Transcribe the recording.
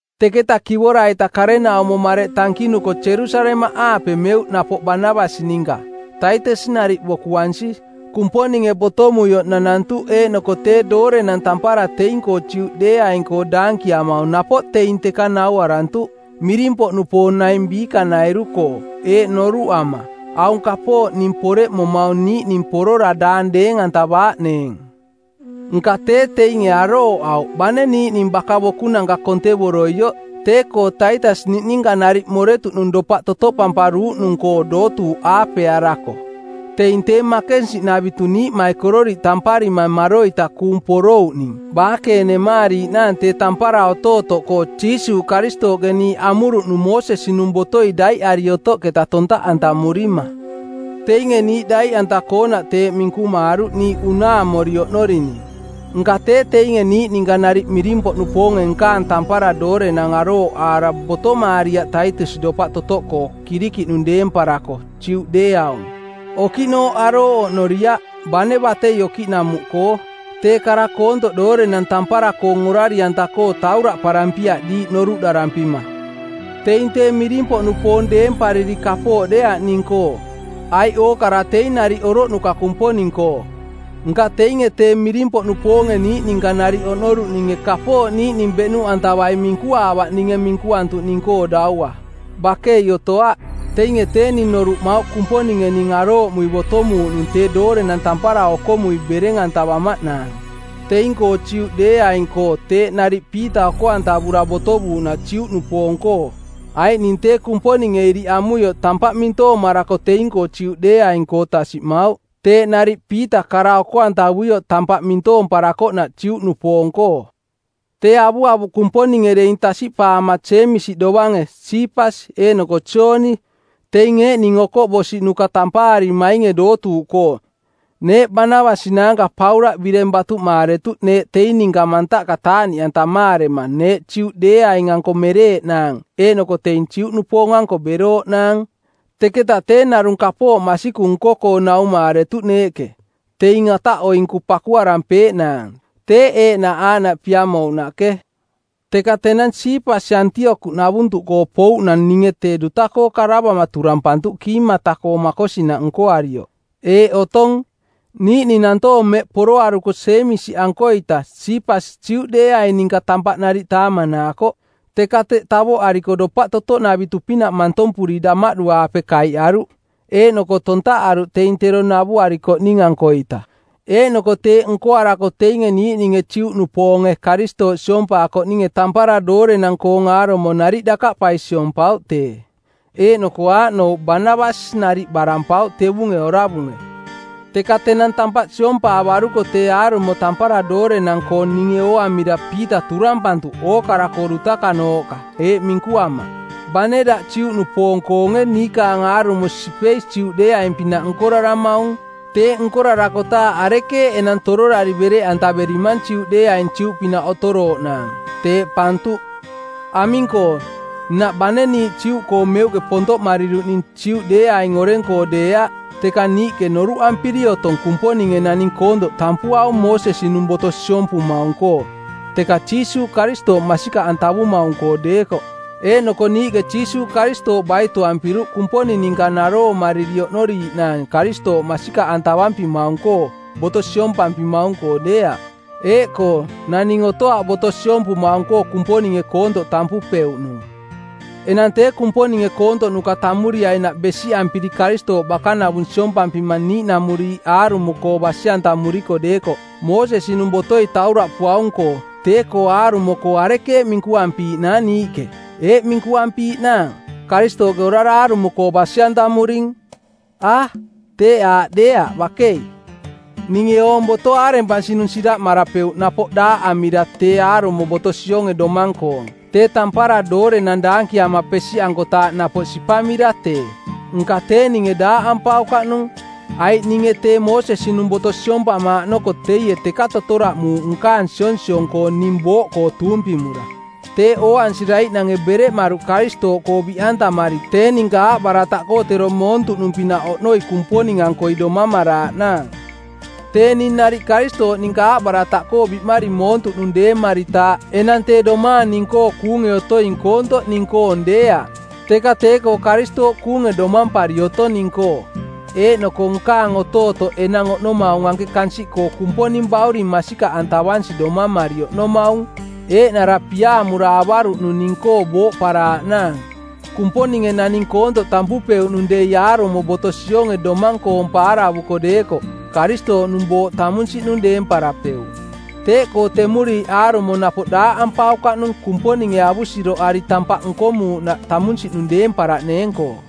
Teketa kivora-ita karenaumo mareꞌ tankinuko Jerusalemaꞌaape meuꞌ napoꞌ Banabas ninka, Taitas nariꞌ bokuansi. Kumponinge botomuioꞌ nanantuꞌ eeꞌnoko tee doorenang tampara teing-koo Juꞌdeeaing-koo daankiamaung napoꞌ teing teka nauarantuꞌ, miring-poꞌnupoong naing biikanairu-koo, eeꞌ noruꞌama: Aung kapooꞌ ning poreꞌmomaung niiꞌning porora daang deeng-antavaaꞌneeng. Nka tee teinge arooꞌauꞌ bane niiꞌning baka-bokunanka kontevoroioꞌ tee-koo Taitas niꞌninka nariꞌ moretuꞌnung dopaꞌ totoꞌpamparuuꞌnung-koo dootuuꞌ aapearako. Teing tee makensiꞌnavitu niiꞌmaikororiꞌ tamparima maroita kuung porouꞌning baakenemaariiꞌnaang tee tampara otootoꞌkoo Jiisuuꞌ Karistooꞌke niiꞌ amuruꞌnung Moosesi-nung botoi daiꞌari otoꞌketa tontaꞌantamurima; Teinge niiꞌ daiꞌanta-koonaꞌ teeꞌ minkumaaruꞌ niiꞌ unaamori oꞌnorining. Nka tee teinge niiꞌ ninka nariꞌ miring-poꞌnupoonge nkaang tampara doorenang arooꞌaara botomaariaꞌ Taitas dopaꞌ totoꞌkoo Kirikiꞌnung deemparako, Juꞌdeeaung. Okiꞌnooꞌ arooꞌ oꞌnoriaꞌ, bane batei okiꞌnamuꞌkoo. Tee kara koontoꞌ doorenang tampara-koong orari-anta-koo tauraꞌparampiaꞌ diiꞌ noruꞌdarampima. Teing tee miring-poꞌnupoong deempariri kapooꞌ deeaꞌ ning-koo, aiꞌ ookara teing nariꞌ oroꞌnuka Kumponing-koo. Nka teinge tee miring-poꞌnupoonge niiꞌ ninka nariꞌ oꞌnoruꞌninge kapooꞌ niiꞌning beꞌnuꞌantavai minkuaavaꞌ ninge minkuantuꞌning-koo daua. Bakei otoaꞌ. Teinge tee ning noruꞌmauꞌ Kumponinge ning arooꞌmui botomuuꞌnung tee doorenang tampara okomui bereng-antavamaꞌnaang teing-koo Juꞌdeeaing-koo teeꞌ nariꞌ Piita oko-antavura botovuuꞌnaꞌ Juꞌnupoong-koo. Aiꞌ ning tee Kumponinge iriꞌ amuioꞌ tampaꞌ mintoomarako teing-koo Juꞌdeeaing-koo tasiꞌmauꞌ, teeꞌ nariꞌ Piita kara-oko-antavuioꞌ tampaꞌ mintoomparakoꞌnaꞌ Juꞌnupoong-koo. Tee avuavuꞌ Kumponinge deing tasiꞌpaama Jeemisi dovange, Siipas eeꞌnoko Jooni, teing eeꞌning okoꞌbosiꞌnuka tampaarimainge dootuuꞌkoo, neeꞌ Banabas naanka Paulaꞌ bireng batuꞌmaaretuꞌ neeꞌ teing ninka mantaꞌka taaꞌniꞌantamaarema neeꞌ Juꞌdeeaing-anko mereeꞌnaang eeꞌnoko teing Juꞌnupoong-anko berooꞌnaang. Teketa tee narung kapooꞌ masikung nko-koo naumaaretuꞌ neeꞌke, teing ataꞌoinku pakuarampeeꞌnaang, teeꞌ eeꞌnaꞌ aaꞌnaꞌ piamouꞌnaꞌke. Teka tenang Siipas Antiokiꞌnavuntuꞌkoo pouꞌnang ninge tee duta-koo karavama turampantuꞌ kiimata-koo makosinaꞌ nkoarioꞌ. Eeꞌ otong: Niiꞌning nantoong mmeꞌ poroaruko Jeemisi-ankoita Siipas Juꞌdeeaing ninka tampaꞌ nariꞌ taamanaakoꞌ. Teka teꞌ tavoꞌariko dopaꞌtotoꞌnavitu-pinaꞌ mantompuri damaꞌdu-aape kaiꞌaruꞌ eeꞌnoko tontaꞌaruꞌ teing tero navuarikoꞌning-ankoita. Eeꞌnoko teeꞌ nkoarako teinge niiꞌninge Juꞌnupoonge Karistooꞌ siompaakoꞌninge tampara doorenang-koong aarumo nariꞌ dakaꞌpai siompauꞌ tee. Eeꞌnoko aaꞌnouꞌ Banabas nariꞌ barampauꞌ tevunge oravunge. Teka tenang tampaꞌ siompaavaruko tee aarumo tampara doorenang-koong ninge ooamira Piita turampantuꞌ ookara-koo dutakanooꞌka eeꞌ minkuama, “Bane daꞌ Juꞌnupoong-koonge niikaang aarumo sipei Juꞌdeeaung-pinaꞌ nkoraramaung. Teeꞌ nkorarakotaaꞌ arekeeꞌ enang tororari bereꞌantaverimang Juꞌdeeaing Juꞌpinaꞌ otorooꞌnaang?” Teeꞌpantuꞌ. Aming-koo, nnaꞌ bane niiꞌ Juꞌkoo meuꞌke pontoꞌmariruꞌning Juꞌdeeaing oreng-koo deeaꞌ, teka niiꞌke noruꞌampiri otong Kumponinge naning koontoꞌ tampuaung Moosesi-nung boto siompumaung-koo, teka Jiisuuꞌ Karistooꞌ masikaꞌantavumaung-koo deekoꞌ. Eeꞌnoko niiꞌke Jiisuuꞌ Karistooꞌ baitoampiruꞌ Kumponing ninka naroomariri oꞌnoriiꞌnaang Karistooꞌ masikaꞌantavampimaung-koo, boto siompampimaung-koo deeaꞌ. Eeꞌkoo, naning otoaꞌ boto siompumaung-koo Kumponinge koontoꞌ tampupeuꞌnung. Enang tee Kumponinge koontoꞌnuka tammuriainaꞌ besiꞌampiri Karistooꞌ bakanavung siompampima niiꞌnamuriiꞌ aarumo-koo basi-antamuriko deekoꞌ, Moosesi-nung botoi tauraꞌpuaung-koo, tee-koo aarumo-koo arekeeꞌ minkuampiiꞌnaang niiꞌke? Eeꞌ ee minkuampiiꞌnaang, “Karistooꞌke orara aarumo-koo basi-antamuring.”? A, teeꞌ aaꞌ deeaꞌ bakei. Ninge oong boto aarempansinung siraꞌmarapeuꞌ napoꞌ daaꞌamira tee aarumo boto sionge domang-koong, tee tampara doorenang daankiama pesiꞌankotaaꞌ napoꞌ sipamira tee. Nka tee ninge daaꞌampaukaꞌnung, aiꞌ ninge tee Moosesi-nung boto siompamaaꞌ noko teie teka totoraꞌmuuꞌ nkaang sionsiong-koo ning booꞌkoo tuumpimura. Teeꞌ ooansiraiꞌnange bereꞌmaruꞌ Karistooꞌkoo biꞌantamari tee ninka aaꞌbarataꞌkoo tero moontuꞌnung-pinaꞌ oꞌnoi Kumponing-ankoi domamaraaꞌnaang. Tee ning nariꞌ Karistooꞌ ninka aaꞌbarataꞌkoo biꞌmari moontuꞌnung deemaritaaꞌ enang tee domaang ning-koo kuunge otoing koontoꞌ ning-koong deeaꞌ, teka tee-koo Karistooꞌ kuunge domampari otong ning-koo. Eeꞌnoko nkaang otootoꞌ enang oꞌnomaung anke kansiꞌkoo Kumponing Bauring masikaꞌantavansi domamari oꞌnomaung, eeꞌnara piaamura avaruꞌnung ning-koo booꞌparaaꞌnaang. Kumponinge naning koontoꞌ tampupeuꞌnung dei aarumo boto sionge domang-koong paaravuko deekoꞌ, Karistooꞌnung booꞌ tamunsiꞌnung deemparapeuꞌ. Teeꞌkoo temuriiꞌ aarumo napoꞌ daaꞌampaukaꞌnung Kumponinge avusiroꞌari tampaꞌ nkomuuꞌnaꞌ tamunsiꞌnung deemparaꞌneeng-koo.